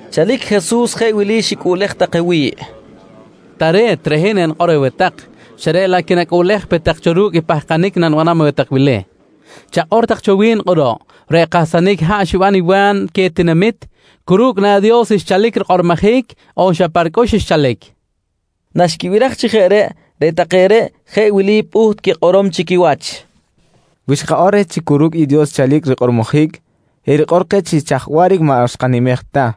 Chalic Jesus jeꞌ wili xicꞌuꞌlej take wi̱ꞌ: «Tare̱t, reꞌ hin enikꞌor aweh tak, xa reꞌ laꞌ quinacꞌuꞌlej pe tak cho ru̱cꞌ i pahkanic nanibanam aweh tak wili: Chakꞌor tak cho wi̱n kꞌuruꞌ, reꞌ kahsanic haꞌ xiban i Wa̱n queh tinamit, cu ru̱cꞌ na Dios xchalic rikꞌormojic on xa pa ricꞌux xchalic? nqui queh. Naxquibiraj chi jeꞌ reꞌ, reꞌ take reꞌ jeꞌ wili pꞌuht quikꞌorom chi quiwach: «Wi xkakꞌor reh chi cu ru̱cꞌ i Dios xchalic rikꞌormojic, erikꞌor keh chi chaj waꞌric maꞌ xkanimej ta.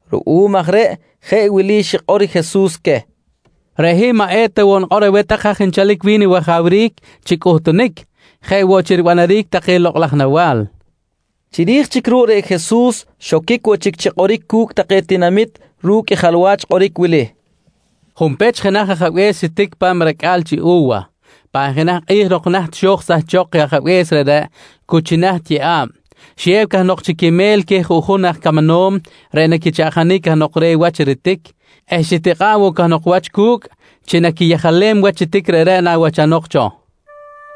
Ruꞌum aj reꞌ jeꞌ wili xikꞌor Jesus queh: «Reꞌ hin maꞌ eta woꞌ nikꞌor aweh tak haj chalic wi̱n i wajawric chi cꞌuhtunic jeꞌ woꞌ chi ribanaric take lokꞌ laj nawa̱l, nqui queh. Chiri̱j chic ruꞌ reꞌ Jesus xoquic woꞌ chic chi kꞌoric cu̱cꞌ take tinamit ru̱cꞌ i jalwach kꞌoric wili: «Junpech jenaj ajabe̱s xitic pa̱m i racꞌa̱l chi u̱wa. Pan jenaj kꞌi̱j nok naht xo̱j sahchok i ajabe̱s reꞌreꞌ cu chi naht yeꞌa̱b, xiyew cahnok chi quimel queh juꞌjun aj camanom reꞌ naquichaꞌjanic cahnok reh wach ritic eh xitikꞌa̱ꞌ woꞌ cahnok wach cu̱cꞌ chi naquiyejalem wach i ritic reꞌreꞌ nawachanok cho.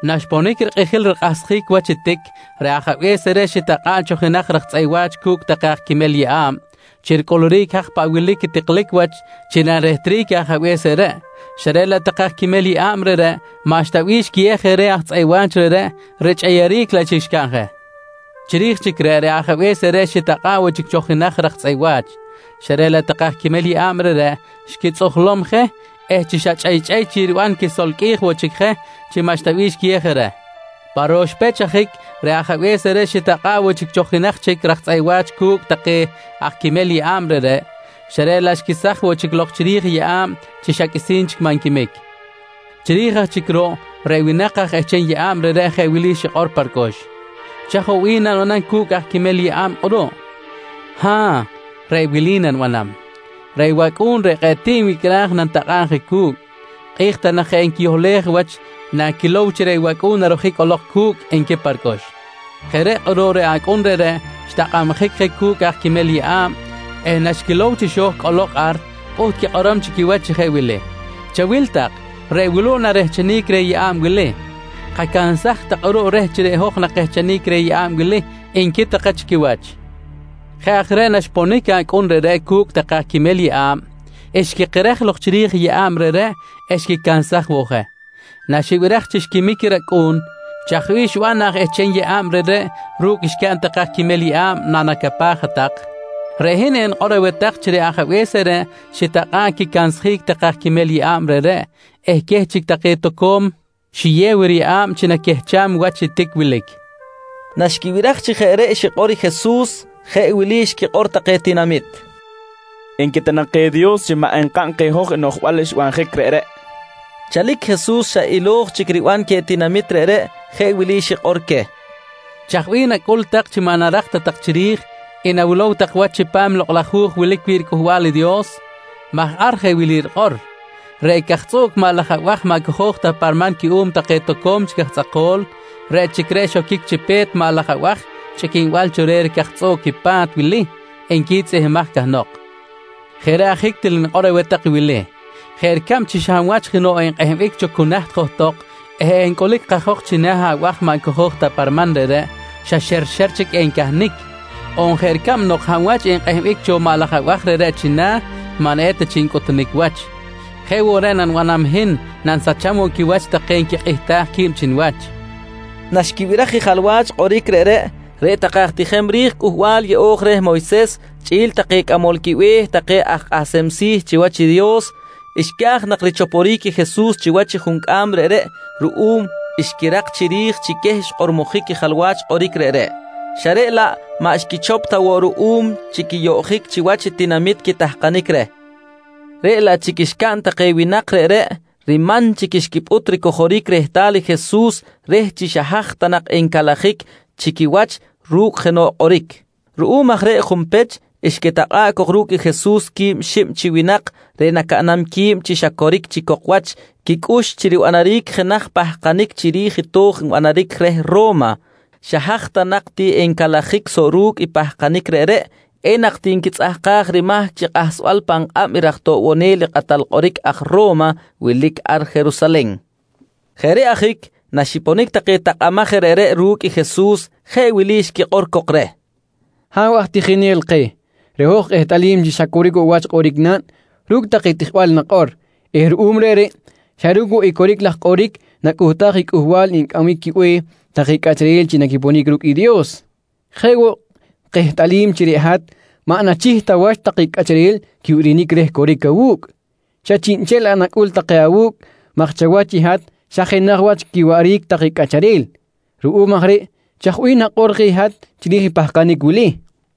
Naxponic rikꞌijil rikꞌahsjic wach i tic, reꞌ ajabe̱s reꞌreꞌ xitakꞌa̱ꞌ cho jenaj raj tzꞌeꞌ wa̱ch cu̱cꞌ take aj quimel riyeꞌa̱b chi ricꞌuluric i haj paꞌ wilic i tiklic wach chi narehtric i ajabe̱s reꞌreꞌ, xa reꞌ laꞌ take aj quimel yeꞌa̱b reꞌreꞌ, maꞌxta bih xquiyew je reh aj tzꞌeꞌ wa̱ch reꞌreꞌ, richꞌeyeric laꞌ chic xcaꞌn je. Chiri̱j chic reꞌ, reꞌ ajabe̱s reꞌreꞌ xitakꞌa̱ꞌ woꞌ chic cho jenaj raj tzꞌeꞌ wa̱ch, xa reꞌ laꞌ take aj quimel yeꞌa̱b reꞌreꞌ xquitzꞌujlom je eh chi xa chꞌeychꞌey chic riban, xquisolqꞌuij woꞌ je chi maꞌxta bih xquiyew je reh. Pa ro̱x pech ajic, reꞌ ajabe̱s reꞌreꞌ xitakꞌa̱ꞌ woꞌ chic cho jenaj chic raj tzꞌeꞌ wa̱ch cu̱cꞌ take aj quimel yeꞌa̱b reꞌreꞌ, xa reꞌ laꞌ xquesaj woꞌ chic lok chiri̱j i yeꞌa̱b chi xa qꞌuisi̱n chic maꞌ nquimic. Chiri̱j aj chic ruꞌ, reꞌ winak ehcham yeꞌa̱b reꞌreꞌ jeꞌ wili xikꞌor pa ricꞌux: ‹Chaj woꞌ bih nanibanam cu̱cꞌ aj quimel yeꞌa̱b kꞌuruꞌ? Ha̱ꞌ, reꞌ wili nanibanam: Reꞌ wacꞌu̱n reꞌ kꞌe̱ꞌ tiꞌ nwicꞌraj nanitakꞌa̱b je cu̱cꞌ. Kꞌi̱j ta nak je enquiyohlej wach naquilow chi reꞌ wacꞌu̱n narojic cꞌolok cu̱cꞌ, nqui pa ricꞌux. «Jeꞌ reꞌ kꞌuruꞌ reꞌ acꞌun reꞌreꞌ xtakꞌabjic je cu̱cꞌ aj quimel yeꞌa̱b eh naxquilow chi xo̱j cꞌolok ar pꞌuht quikꞌorom chi quiwach chi jeꞌ wili: ‹Chawil tak, reꞌ wuluꞌ narehchenic reh yeꞌa̱b wili. Kacansaj tak kꞌuruꞌ reh chi reꞌ hoj nakehchenic reh yeꞌa̱b wili, nqui take chi quiwach. «Jeꞌ aj reꞌ naxponic acꞌun reꞌreꞌ cu̱cꞌ take aj quimel yeꞌa̱b, xquikerej lok chiri̱j yeꞌa̱b reꞌreꞌ eh xquicansaj woꞌ je. Naxibiraj chi xquimic i racꞌu̱n, chaj bih xiban aj ehcham yeꞌa̱b reꞌreꞌ ru̱cꞌ xcaꞌn take aj quimel yeꞌa̱b, nacapaj hat-tak? Reꞌ hin enikꞌor aweh tak chi reꞌ ajabe̱s reꞌreꞌ, xitakꞌa̱ꞌ quicansjic take aj quimel yeꞌa̱b reꞌreꞌ eh queh chic take toco̱m xiyew riyeꞌa̱b chi naquehcham i wach i tic wilic, nqui Jesus. Naxquibiraj chi jeꞌ reꞌ xikꞌor i Jesus jeꞌ wili xquikꞌor take tinamit: «Nqui ta nak je Dios chi maꞌ nkaꞌn keh hoj i noꞌjbal xbanjic reꞌreꞌ, nqui take. Chalic Jesus xa ilo̱j chic riban queh tinamit reꞌreꞌ jeꞌ wili xikꞌor queh: «Chaj bih nacꞌul tak chi maꞌ narak ta tak chiri̱j i nawilow tak wach chipam i Lokꞌ laj Hu̱j wilic wi̱ꞌ riCꞌuhbal i Dios? maj ar jeꞌ wili rikꞌor: “Reꞌ cajtzꞌuꞌc laj maꞌ laj abaj maꞌ cojo̱j ta pa riman cuꞌum take toco̱m chic aj tzꞌako̱l, reꞌ chic reꞌ xoquic chi pe̱t maꞌ laj abaj chꞌiquinbal cho reh ricajtzꞌuꞌc i pa̱t wili, nqui tzꞌihmbimaj cahnok. «Jeꞌ reꞌ ajic til nikꞌor aweh tak i wili: Jeꞌ ricab chi xa hab wach jenoꞌ enkꞌehbic cho cu naht johtok eh encꞌulic kajok china̱ abaj maꞌ cojo̱j ta pa riman reꞌreꞌ, xa xerxer chic encahnic on jeꞌ ricab nok hab wach enkꞌehbic cho maꞌ laj abaj reꞌreꞌ china̱, maꞌ eta chic ncꞌutunic wach, jeꞌ woꞌ reꞌ nanibanam i hin nanisacham woꞌ quiwach take nquikꞌihtaj qui̱b chi niwach, nqui Jesus queh. Naxquibiraj i jalwach kꞌoric reꞌreꞌ, reꞌ take aj tijem ri̱j Cꞌuhbal Yeꞌo̱j reh Moyses chꞌi̱l take cꞌamol quibe̱h take aj kꞌahsem si̱ chiwach i Dios, xca̱j nak richoporic i Jesus chiwach i juncꞌam reꞌreꞌ ruꞌum xquirak chiri̱j chi queh xkꞌormojic i jalwach kꞌoric reꞌreꞌ, xa reꞌ laꞌ maꞌ xquichop ta woꞌ ruꞌum chi quiyoꞌjic chiwach i tinamit quitahkanic reh. Reꞌ laꞌ chic xcaꞌn take winak reꞌreꞌ, riman chic xquipꞌut ricojoric rehtal i Jesus reh chi xa haj ta nak encalajic chi quiwach ru̱cꞌ jenoꞌ kꞌoric. Ruꞌum aj reꞌ junpech xquitakꞌa̱ꞌ cok ru̱cꞌ Jesus quib xib chi winak reꞌ nacaꞌnam qui̱b chi xa coric chic cok wach quicꞌux chi ribanaric jenaj pahkanic chiri̱j i to̱j nbanaric reh Ro̱ma. Xa haj ta nak ti encalajic soꞌ ru̱cꞌ i pahkanic reꞌreꞌ, enak ti nquitzꞌahkaj rimahc chi kꞌahsbal pan kꞌab i raj toꞌbonel i kꞌatal kꞌoric aj Ro̱ma wilic ar Jerusalen. Jeꞌ reꞌ ajic naxiponic take takꞌamaj je reꞌreꞌ ru̱cꞌ i Jesus, jeꞌ wili xquikꞌor cok reh: «Ha̱w aj tijinel keh, reꞌ hoj kehtꞌalim chi xa coric woꞌ wach kꞌoric naꞌn ru̱cꞌ take tijbal nakꞌor eh ruꞌum reꞌreꞌ xa ru̱cꞌ woꞌ coric laj kꞌoric nacꞌuhtaj i cꞌuhbal ncꞌambic quibe̱h take cꞌacharel chi naquiponic ru̱cꞌ i Dios. Jeꞌ woꞌ kehtꞌalim chi reꞌ hat maꞌ nachih ta wach take cꞌacharel quibirinic reh coric awu̱cꞌ, xa chiꞌnchel laꞌ nacꞌul take awu̱cꞌ maj chawach i hat xa jenaj wach quiwaꞌric take cꞌacharel. Ruꞌum aj reꞌ chaj bih nakꞌor keh i hat chiri̱j i pahkanic wili: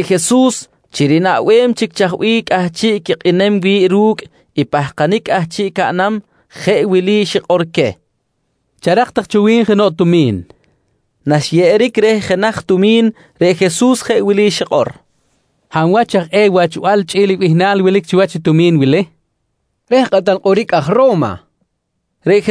Reꞌ Jesus chi rinaꞌbem chic chaj bih cꞌahchiꞌ quikꞌinem wi̱ꞌ ru̱cꞌ i pahkanic cꞌahchiꞌ caꞌnam, jeꞌ wili xikꞌor queh: «Charak tak cho wi̱n jenoꞌ tumi̱n, nqui queh. Naxyeꞌeric reh jenaj tumi̱n reꞌ Jesus jeꞌ wili xikꞌor: «Hab wach aj eh i wachbal chꞌi̱l i bihnal wilic chiwach i tumi̱n wili? nqui queh. —Reh kꞌatal kꞌoric aj Ro̱ma, nqui take reh.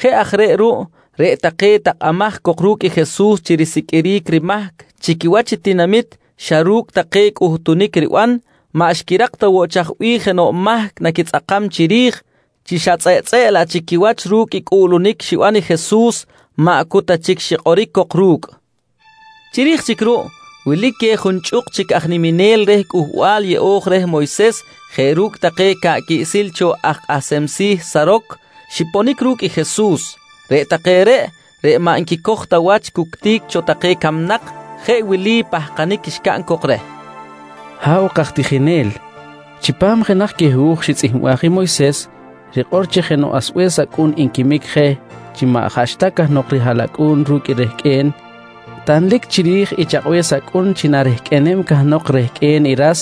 Jeꞌ aj reꞌ ruꞌ reꞌ take takꞌamaj cok ru̱cꞌ Jesus chi risiqꞌuiric rimahc chi quiwach i tinamit xa ru̱cꞌ take cꞌuhtunic riban, maꞌ xquirak ta woꞌ chaj bih jenoꞌ mahc naquitzꞌakam chiri̱j, chi xa tzꞌeꞌtzꞌeꞌ laꞌ chic quiwach ru̱cꞌ i cꞌuꞌlunic xiban i Jesus, maꞌ cu ta chic xikꞌoric cok ru̱cꞌ. Chiri̱j chic ruꞌ, wilic queh junchꞌuk chic aj niminel reh Cꞌuhbal Yeꞌo̱j reh Moyses jeꞌ ru̱cꞌ take ca̱ꞌ quiꞌsil cho aj kꞌahsem si̱ Saroc xiponic ru̱cꞌ i Jesus. Reꞌ take reꞌ, reꞌ maꞌ nquicoj ta wach cuctic cho take camnak jeꞌ wili pahkanic xcaꞌn cok reh: «Ha̱w kaj tijinel, chipam jenaj queh hu̱j xitzꞌihmbaj i Moyses rikꞌor chi jenoꞌ asbe̱s acꞌun nquimic je chi maꞌ jaꞌxta cahnok rihaꞌlacꞌu̱n ru̱cꞌ i rehqꞌue̱n, tanlic chiri̱j i chakꞌbe̱s acꞌun chi narehqꞌuenem cahnok rehqꞌue̱n i ras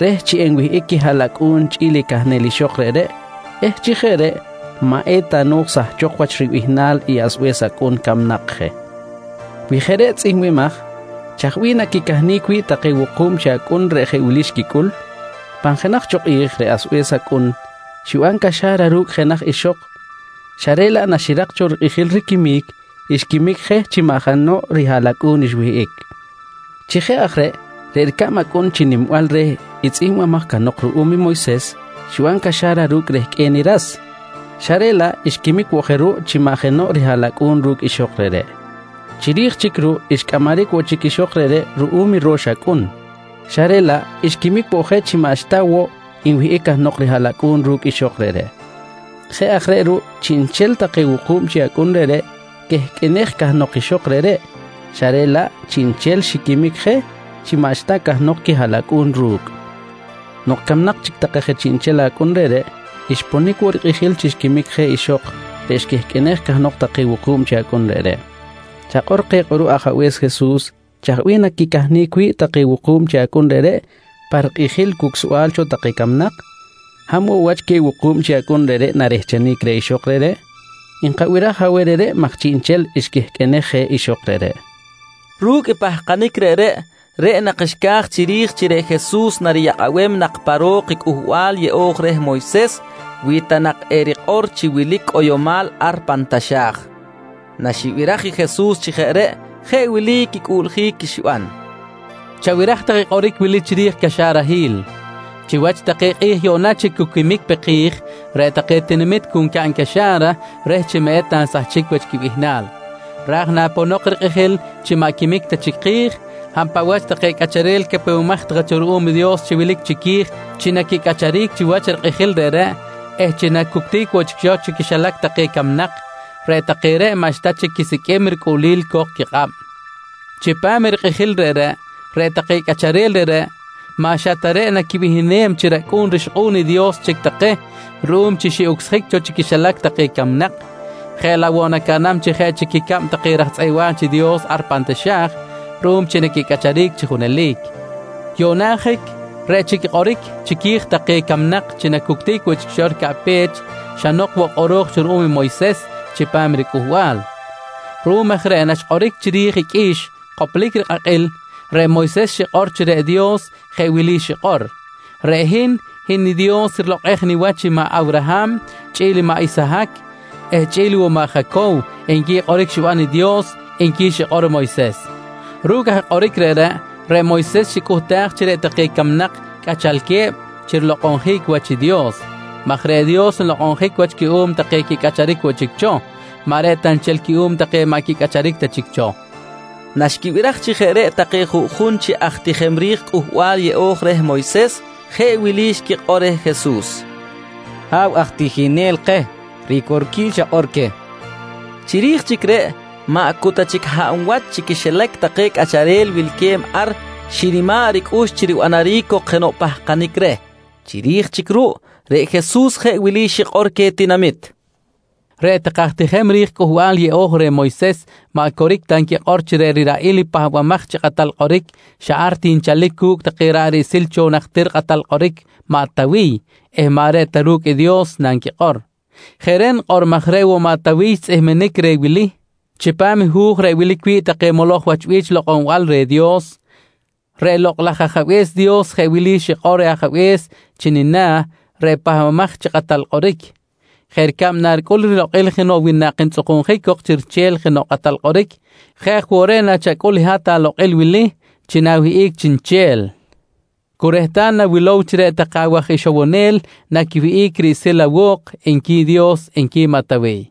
reh chi enwihꞌic quihaꞌlacꞌu̱n chꞌi̱l i cahnel ixok reꞌreꞌ eh chi jeꞌ reꞌ maꞌ eta no̱j sahchok wach ribihnal i asbe̱s acꞌun camnak je. Wi jeꞌ reꞌ tzꞌihmbimaj, chaj bih naquicahnic wi̱ꞌ take wuku̱b chi acꞌun reꞌ jeꞌ wili xquicꞌul? Pan jenaj cho kꞌi̱j reꞌ asbe̱s acꞌun xiban caxa̱ra ru̱cꞌ jenaj ixok xa reꞌ laꞌ naxirak cho rikꞌijil riquimic, xquimic je chi maꞌ jenoꞌ rihaꞌlacꞌu̱n xwihꞌic. Chi jeꞌ aj reꞌ, reꞌ ricab acꞌun chi nimbal reh i tzꞌihmbimaj cahnok ruꞌum i Moyses xiban caxa̱ra ru̱cꞌ rehqꞌue̱n i ras, xa reꞌ laꞌ xquimic woꞌ je ruꞌ chi maꞌ jenoꞌ rihaꞌlacꞌu̱n ru̱cꞌ ixok reꞌreꞌ. Chiri̱j chic ruꞌ, xcꞌamaric woꞌ chic ixok reꞌreꞌ ruꞌum i ro̱x acꞌun, xa reꞌ laꞌ xquimic woꞌ je chi maꞌxta woꞌ nwihꞌic cahnok rihaꞌlacꞌu̱n ru̱cꞌ ixok reꞌreꞌ. Jeꞌ aj reꞌ ruꞌ, chiꞌnchel take wuku̱b chi acꞌun reꞌreꞌ quehqꞌuenej cahnok ixok reꞌreꞌ, xa reꞌ laꞌ chiꞌnchel xiquimic je chi maꞌxta cahnok quihaꞌlacꞌu̱n ru̱cꞌ. Nok camnak chic take je chiꞌnchel chi acꞌun reꞌreꞌ, xponic woꞌ rikꞌijil chi xquimic je ixok reꞌ xquehqꞌuenej cahnok take wuku̱b chi acꞌun reꞌreꞌ. Chakꞌor keh kꞌuruꞌ Ajabe̱s Jesus, chaj bih naquicahnic wi̱ꞌ take wuku̱b chi acꞌun reꞌreꞌ pa rikꞌijil cucsbal cho take camnak? Hab woꞌ wach queh wuku̱b chi acꞌun reꞌreꞌ narehchenic reh ixok reꞌreꞌ? Nkabiraj aweh reꞌreꞌ maj chiꞌnchel xquehqꞌuenej je ixok reꞌreꞌ, nqui take reh. Ru̱cꞌ pahkanic reꞌreꞌ, reꞌ nak xca̱j chiri̱j chi reꞌ Jesus nariyakꞌabem nak pa ro̱k i Cꞌuhbal Yeꞌo̱j reh Moyses wi ta nak erikꞌor chi wilic cꞌoyomal ar pan taxa̱j. Naxibiraj i Jesus chi jeꞌ reꞌ, jeꞌ wili quicꞌuꞌljic xiban: «Chabiraj tak kꞌoric wili chiri̱j i caxarahil: Chiwach take kꞌi̱j yuꞌna chi cu quimic pe ki̱j, reꞌ take tinamit cu ncaꞌn caxa̱ra reh chi maꞌ eta nsahchic wach quibihnal, ra̱j naponok rikꞌijil chi maꞌ quimic ta chic ki̱j, hab paꞌ wach take cꞌacharel capewemaj take cho ruꞌum i Dios chi wilic chiqui̱j chi naquicꞌacharic chiwach rikꞌijil reꞌreꞌ eh chi nacuctic woꞌ chic cho chi quixilac take camnak, reꞌ take reꞌ maꞌxta chic quisiqꞌuim ricꞌuꞌlil co̱k quikꞌab. Chipam i rikꞌijil reꞌreꞌ, reꞌ take cꞌacharel reꞌreꞌ maꞌ xa ta reꞌ naquibihnem chi racꞌu̱n rixkꞌu̱n i Dios chic take ruꞌum chi xiꞌucsjic cho chi quixilac take camnak, jeꞌ laꞌ woꞌ nacaꞌnam jeꞌ chic ricab take raj tzꞌeꞌ wa̱ch i Dios ar pan taxa̱j ruꞌum chi naquicꞌacharic chi junelic. «Yuꞌna ajic reꞌ chic kꞌoric chiqui̱j take camnak chi nacuctic woꞌ chic ricaꞌpech xa nok woꞌ kꞌoro̱j cho ruꞌum Moyses chipam ricꞌuhbal. Ruꞌum aj reꞌ naxkꞌoric chiri̱j i qꞌui̱x koplic rikꞌakꞌil, reꞌ Moyses xikꞌor chi reꞌ Dios jeꞌ wili xikꞌor: “Reꞌ hin, hin i Dios rilokꞌej niwach i maꞌ Awraham chꞌi̱l i maꞌ Isahac eh chꞌi̱l woꞌ i maꞌ Jacow, nqui kꞌoric xiban i Dios, nqui xikꞌor Moyses. «Ru̱cꞌ aj kꞌoric reꞌreꞌ, reꞌ Moyses xicꞌuhtaj chi reꞌ take camnak cꞌachalque̱b chi rilokꞌonjic wach i Dios maj reꞌ Dios, nlokꞌonjic wach cuꞌum take quicꞌacharic woꞌ chic cho, maꞌ reꞌ ta nchel cuꞌum take maꞌ quicꞌacharic ta chic cho, nqui xikꞌor Jesus. Naxquibiraj chi jeꞌ reꞌ take juꞌjun chi aj tijem ri̱j Cꞌuhbal Yeꞌo̱j reh Moyses, jeꞌ wili xquikꞌor reh Jesus: «Ha̱w aj tijinel keh, ricorquil xakꞌor queh, nqui take reh. Chiri̱j chic reꞌ, maꞌ cu ta chic hab wach chi quixilac take cꞌacharel wilque̱b ar xinima̱ꞌ ricꞌux chi ribanjic cok jenoꞌ pahkanic reh. Chiri̱j chic ruꞌ reꞌ Jesus jeꞌ wili xikꞌor queh tinamit: «Reꞌ take aj tijem ri̱j Cꞌuhbal Yeꞌo̱j reh Moyses maꞌ coric ta nquikꞌor chi reꞌ riraꞌil i Pahbamaj chi Kꞌatal Kꞌoric xa ar ti nchalic cu̱cꞌ take ra̱ꞌ riꞌsil cho i aj najtir kꞌatal kꞌoric maꞌ Tawiy eh maꞌ reꞌ ta ru̱cꞌ i Dios nanquikꞌor. Jeꞌ reꞌ nikꞌor maj reꞌ woꞌ maꞌ Tawiy xtzꞌihminic reh i wili chipam i hu̱j reꞌ wilic wi̱ꞌ take moloj wach bi̱ch lokꞌonbal reh Dios: “Reꞌ Lokꞌ laj Ajabe̱s Dios jeꞌ wili xikꞌor reh Ajabe̱s chi nina̱ reꞌ Pahbamaj chi Kꞌatal Kꞌoric: ‘Jeꞌ ricab naricꞌul rilokꞌil jenoꞌ winak ntzꞌukunjic cok chi riche̱l jenoꞌ kꞌatal kꞌoric, jeꞌ aj woꞌ reꞌ nachacꞌul i hat alokꞌil wili: Chi na̱wihꞌic chiniche̱l cu rehtal nawilow chi reꞌ take awaj ixowonel naquiwihꞌic riꞌsil awo̱k, nqui Dios, nqui maꞌ Tawiy.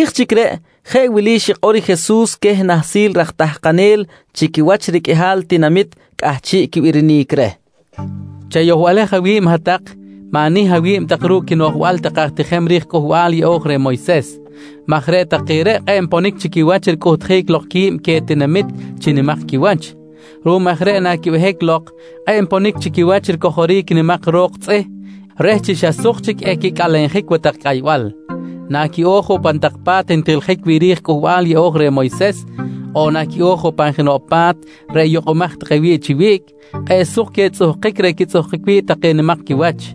Chiri̱j chic reꞌ, jeꞌ wili xikꞌor i Jesus queh nahsil raj tahkanel chi quiwach riqꞌuihal tinamit cꞌahchiꞌ quibirinic reh: «Chayohbalej awi̱b hat-tak, ma̱nih awi̱b tak ru̱cꞌ quinoꞌjbal take aj tijem ri̱j Cꞌuhbal Yeꞌo̱j reh Moyses maj reꞌ take reꞌ kꞌe̱ꞌ nponic chi quiwach ricꞌuhtjic lok qui̱b queh tinamit chi nimak quiwach. Ruꞌum aj reꞌ naquibehic lok, kꞌe̱ꞌ nponic chi quiwach ricojoric nimak tak ro̱k tzꞌih reh chi xa suk chic equicꞌalenjic watak cꞌaybal. Naquiꞌo̱j woꞌ pan tak pa̱t ntijiljic wi̱ꞌ ri̱j Cꞌuhbal Yeꞌo̱j reh Moyses, on naquiꞌo̱j woꞌ pan jenoꞌ pa̱t reꞌ yukꞌumaj take wi̱ꞌ chi wiꞌc, kꞌe̱ꞌ suk queh tzꞌuhkic reꞌ quitzꞌuhkic wi̱ꞌ take nimak quiwach.